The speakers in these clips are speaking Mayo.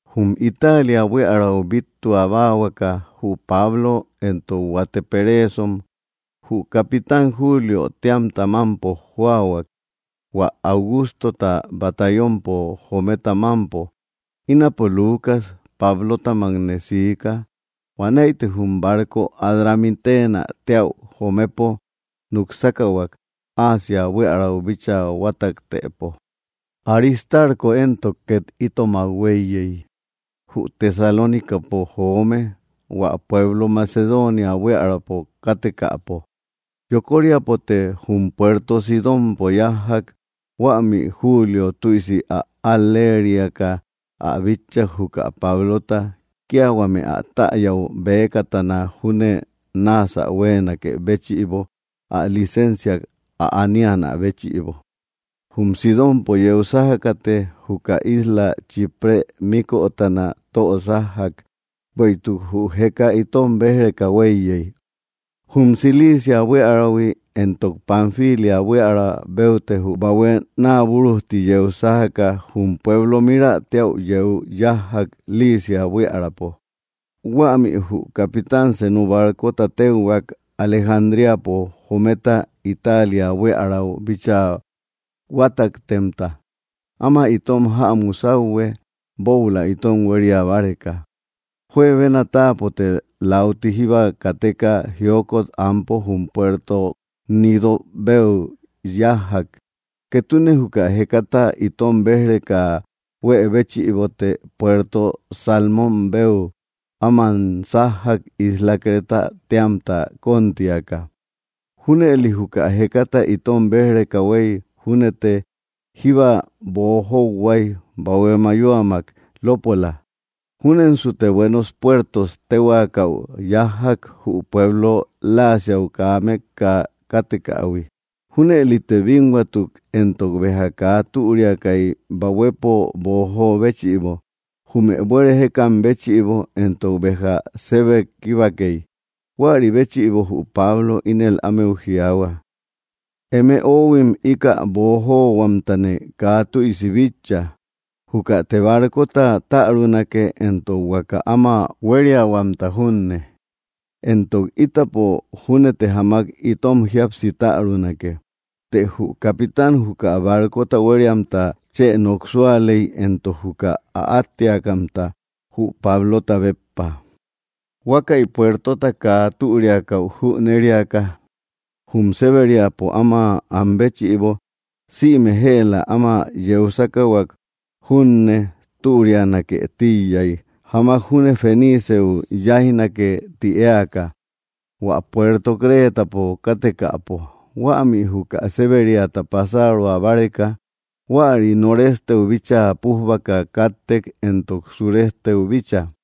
Jum Italia buíarau bíttua báahuaka jü Pablo éntok huate peréesom jü capitán Júliö téamta mampo jóahuak, hua Augústota batallonpo jometa mampo. Ínapo Lucas, Pablótamakne siika. Huanäite jum barco Adramítena teäu jomepo nuk sákahuak, Asia buiärau bíchaa huátaktëpo. Aristarko éntok, ket itomak hueiyei, jü Tesalónicapo joome, hua pueblo Macedonia buíaräpo káttekäpo. Yokóriapote jum puerto Sidonpo yájjak. Huämi Julio tüisi ä al‑lériaka ä bitchak juka Pablota, kia huame ä täyäu bëkatana júne náasä huéenakë béchïbo ä licénciak ä aníanä béchïbo. Jum Sidonpo yeu sájakate juka isla Chíprë míkötana tösájjak, bueïtuk jü jeka itom béj‑reka hueiyei. Jum Cilicia buiärahui, éntok Panfilia buiära beute jü bahue naabúrujti yeu sájaka jum pueblo Mírä teäu yeu yájjak, Licia buíaräpo. Huämi jü capitán senu barcota téuhuak Alejandríapo jometa Italia buíarau bíchaa huátaktemta ama itom jämu sauhue buoula itom huéria báreka. Juebena táapote läuti jíba kateka, jiókot anpo jum puerto Gnídö beu yájjak. Ketune juka jekata itom béj‑reka huë béchïbote puerto Salmón beu áman sájjak isla Cretä téamta kontíaka. Júnëli juka jekata itom béj‑reka huei júnete jíba boojohuai bahué mayóamak lópola. Júnensute Buenos Puertos téhuakäu yájjak, jü pueblo Laséäu kaa mekka káttekähui. Júnëlite bínhuatuk, éntok béja kaa türiakai bahuepo boojo béchïbo, jume buere jékam béchïbo éntok béja sebe kíbakei. Huäri béchïbo jü Pablo ínel ámeu jiaahua: —Eme oóhuim, ika boojóohuamtane kaa tüisi bitcha. Júkate barcota tärunake éntok huaka áma huériahuamta junne, éntok ítapo júnete jamak itom jíapsi tärunake. Të jü capitán juka barcota huériamta chë nok súalei éntok juka ä átteakamta, jü Pablota béppa. Huákäi puertota kaa türiakäu jünériaka jum séberiapo áma anbéchïbo, sïme jëla áma yeu sákahuak junne türianake tíiyai, jamak júne Feniceu yáijnake ti éaka, hua puerto Cretapo kátekäpo, huämi juka séberiata pasároa báreka. Huäri noresteu bíchaa pújbaka káttek éntok suresteu bícha.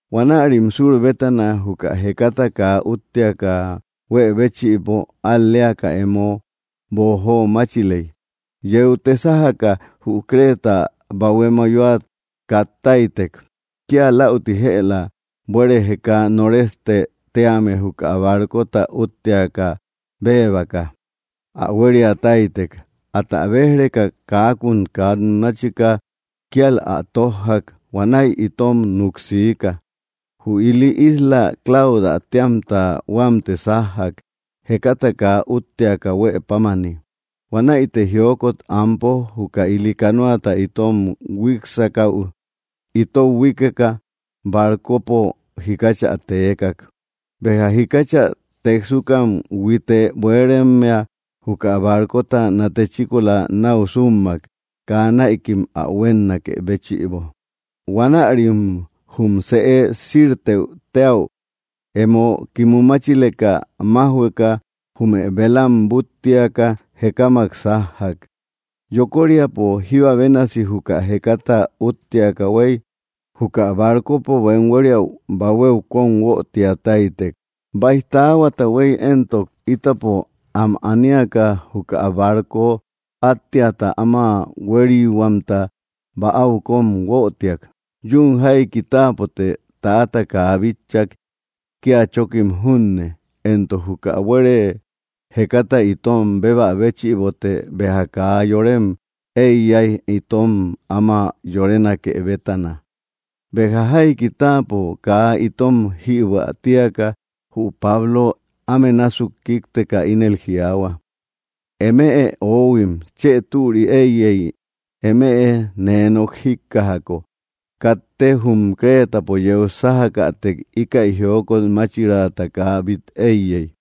Huanärim sur bétana juka jekata kaa útteaka huë béchïbo al‑léaka emo boojóomáchilek. Yeute sájaka jü Creta bahué mayóat kattáitek. Kia lauti jëla buere jeka Noréstë téame juka barcota útteaka béebaka, ä huéria táytek. Atä béj‑reka kaakun kat máchika kíal ä tójjak; huanäi itom nuk siika. Jü ili isla Claudä téamta huamte sájjak, jekata kaa útteaka huëpámani. Huanäite jiókot anpo juka ili canoata itom huíksakäu itou huíkeka barcopo jikáchä teekak. Béja jikáchä téksukam huite buerémmia juka barcota nate chíkola nau súmmak kaa näikim ä huénnakë béchïbo. Huanärim jum sëéu Sírtë téäu emo kimumáchileka májhueka, jume velam búttiaka jekámak sájjak. Yokóriapo jíba bénasi juka jekata útteaka huei, juka barcopo bem huériäu bahuéu kom huötiatáitek. Baij taáhuata huei éntok, ítapo am aníaka juka barco átteata áma huériihuamta bäau kom huötiak. Yuun jaiki táapote täata kaa bitchak, kia chokim junne, éntok juka buere jekata itom bébä béchïbote béja kaa yorem eiyai itom áma yorénake bétana. Béja jaiki táapo kaa itom jïbuä tíaka jü Pablo áme násuk kíkteka ínel jiaahua: —Eme oóhuim, chë türi eiyei eme nee nok jíkkajako. Katte jum Cretapo yeu sájakätek íkäi jiókot máchiraata kaa bít eiyey,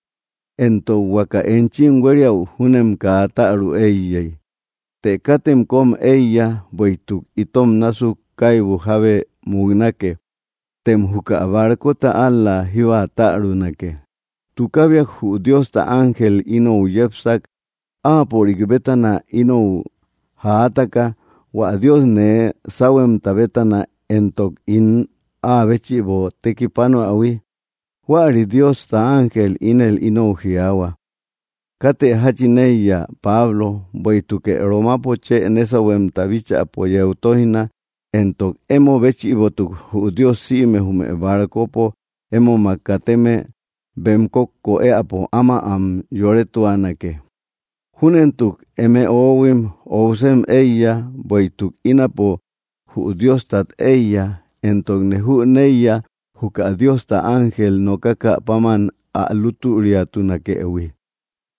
éntok huaka enchim huériäu júnem kaa tärü eiyei. Të katem kom eiya, bueïtuk ito násuk kaibu jábe muknake, tem juka barcota ál‑la jíba tärunake. Tukábiak jü Diosta ángel inou yépsak, áapörik bétana inou jaatáka, hua Dios nee sáuhuemta bétana éntok hua ín áa béchïbo tekipánoähui. Huäri Diosta ángel ínel inou jiaahua: “Kátë jachin eiya, Pablo, bueïtukë Romapo chë nésauhuemta bíchäpo yeu toijna, éntok emo béchïbotuk jü Dios sïme jume barcopo émomak kateme bem kókko éäpo áma am yoretuanake.” Júnentuk, eme oóhuim, óusem eiya, bueïtuk ínapo jü Dióstat eiya, éntokne jüneiya juka Diosta ángel nokakä páman ä lútüriatunakëhui.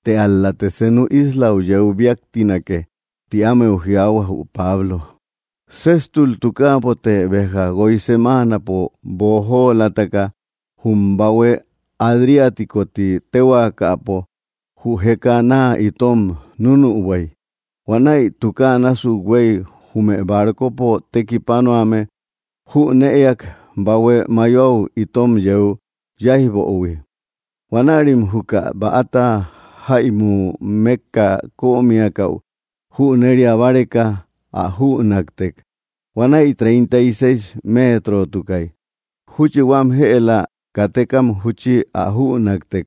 Të ál‑late senu islau yeu biáktinake —ti ámeu jiaahua jü Pablo. Séjtul tukáapote, béja guoi semáanapo boojóolataka, jum bahué Adriatico ti téhuaakapo jü jeká naa itom núnübuai, huanäi tukáa násuk huei jume barcopo tekipánoame jünëak bahué mayoau itom yeu yáijböhui. Huanärim juka bäta jäimu mekka kömiakäu jünéria báreka ä jünaktek. Huanäi treinta y seis métrotukai. Júchi huam jëla katékam júchi ä jünaktek.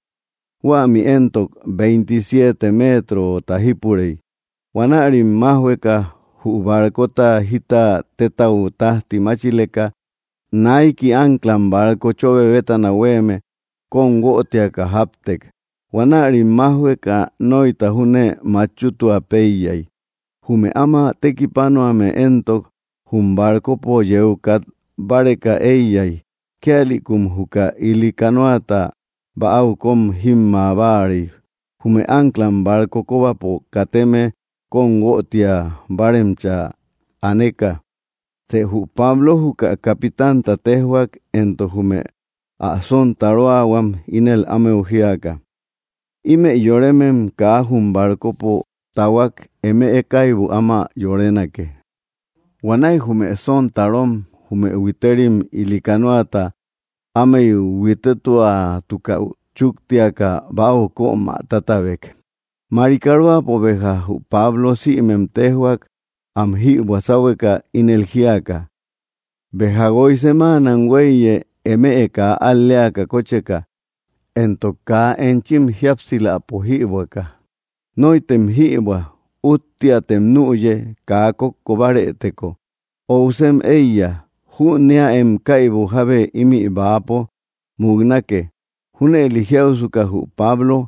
Huämi éntok, veintisiete metrota jípurey. Huanärim májhueka jü barcota jita tetau tajti máchileka, naiki anclam barco chobe bétana huéeme kom huötiaka jáptek. Huanärim májhueka noita júne machútua peiyai. Jume áma tekipánoame éntok, jum barcopo yeu kat báreka eiyai. Kíalïkum juka ili canoata bäau kom jímma báarei, jume anclam barco kóbapo kateme kom huötia báaremcha aneka. Të jü Pablo juka capitanta téjhuak éntok jume ä sontaróahuam, ínel ámeu jiaka: —Ímëi yorémem kaa jum barcopo tahuak, eme kaibu áma yorénake. Huanäi jume sontarom jume huitérim ili canoata ámei huítetuatukäu chúktiaka bäau kömä tátabek. Marikaróapo béja jü Pablo sïmem téjhuak am jïbuä sáhueka. Ínel jíaka: —Béja guoi semáana huéiye eme kaa al‑léaka kócheka, éntok kaa enchim jíapsiläpo jïbuäka. Nóitem jïbuä. Útteatem nüye kaa kókko bárëteko. Óusem éiya. Jüneäem kaibu jábe ímï bäapo muknake. Júnëli jiausuka jü Pablo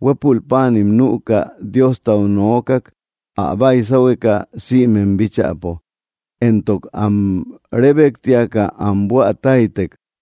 huépul páanim nüka Diostau nokak ä baisáuhueka sïmem bíchäpo, éntok am rébektiaka am buätáitek.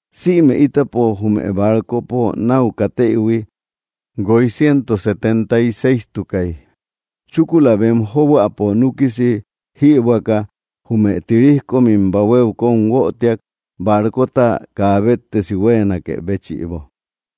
Sïme ítapo jume barcopo nau katéïhui guoi ciento setenta y séistukai. Chúkula bem jóboäpo núkisi jïbuäka, jume tiríjkomim bahuéu kom huötiak barcota kaa béttesi huéenakë béchïbo.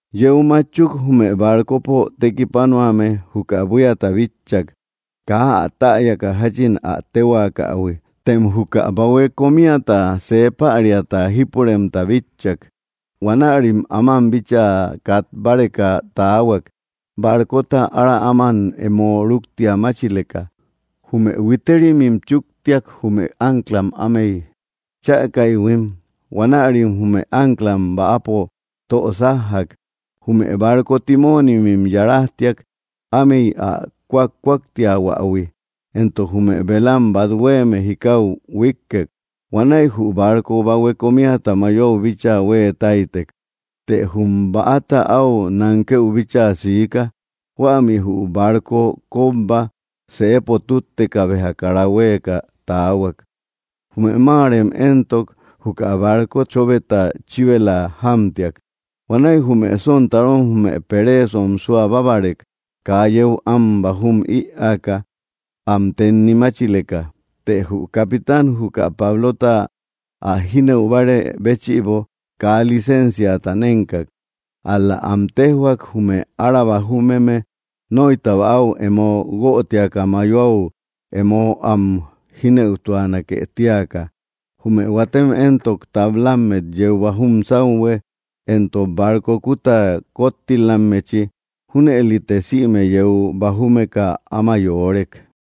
Yeu matchuk jume barcopo tekipánoame juka buíata bitchak, kaa ä täyaka jachin ä téhuaakähui. Tem juka bahué komíata see päriata jípuremta bitchak. Huanärim áman bíchaa kat báreka taahuak, barcota ára áman emo rúktia máchileka. Jume huiterimim chúktiak jume ánclam ámey chäkaïhuim, huanärim jume anclam bäapo tö sájjak. Jume barco timónimim yarajtiak ámey ä kúakúaktiahuähui, éntok jume velam bat huéeme jikau huíkkek. Huanäi jü barco bahue komiata mayoau bíchaa huée táytek. Të jum bäata au nánkëu bíchaa siká, huämi jü barco kobba sëepo tútteka béja kara huéeka taáahuakk. Jume máarem éntok, juka barco chóbeta chíbela jámtiak. Huanäi jume sontarom jume peréesom suabábarek kaa yéu am bajúm ïaaka, am tennimáchileka. Të jü capitán juka Pablota ä jínëubárë béchïbo kaa licénciata nénkak, ál‑la am téjhuak jume ára bajúmeme noita bäau emo huötiaka mayoau emo am jínëutuanake tíaka, jume huátem éntok, tablámmet yeu bajúm sauhue éntok barco kuta kóttilammechi. Júnëlite sïme yeu bajúmeka áma yoórek.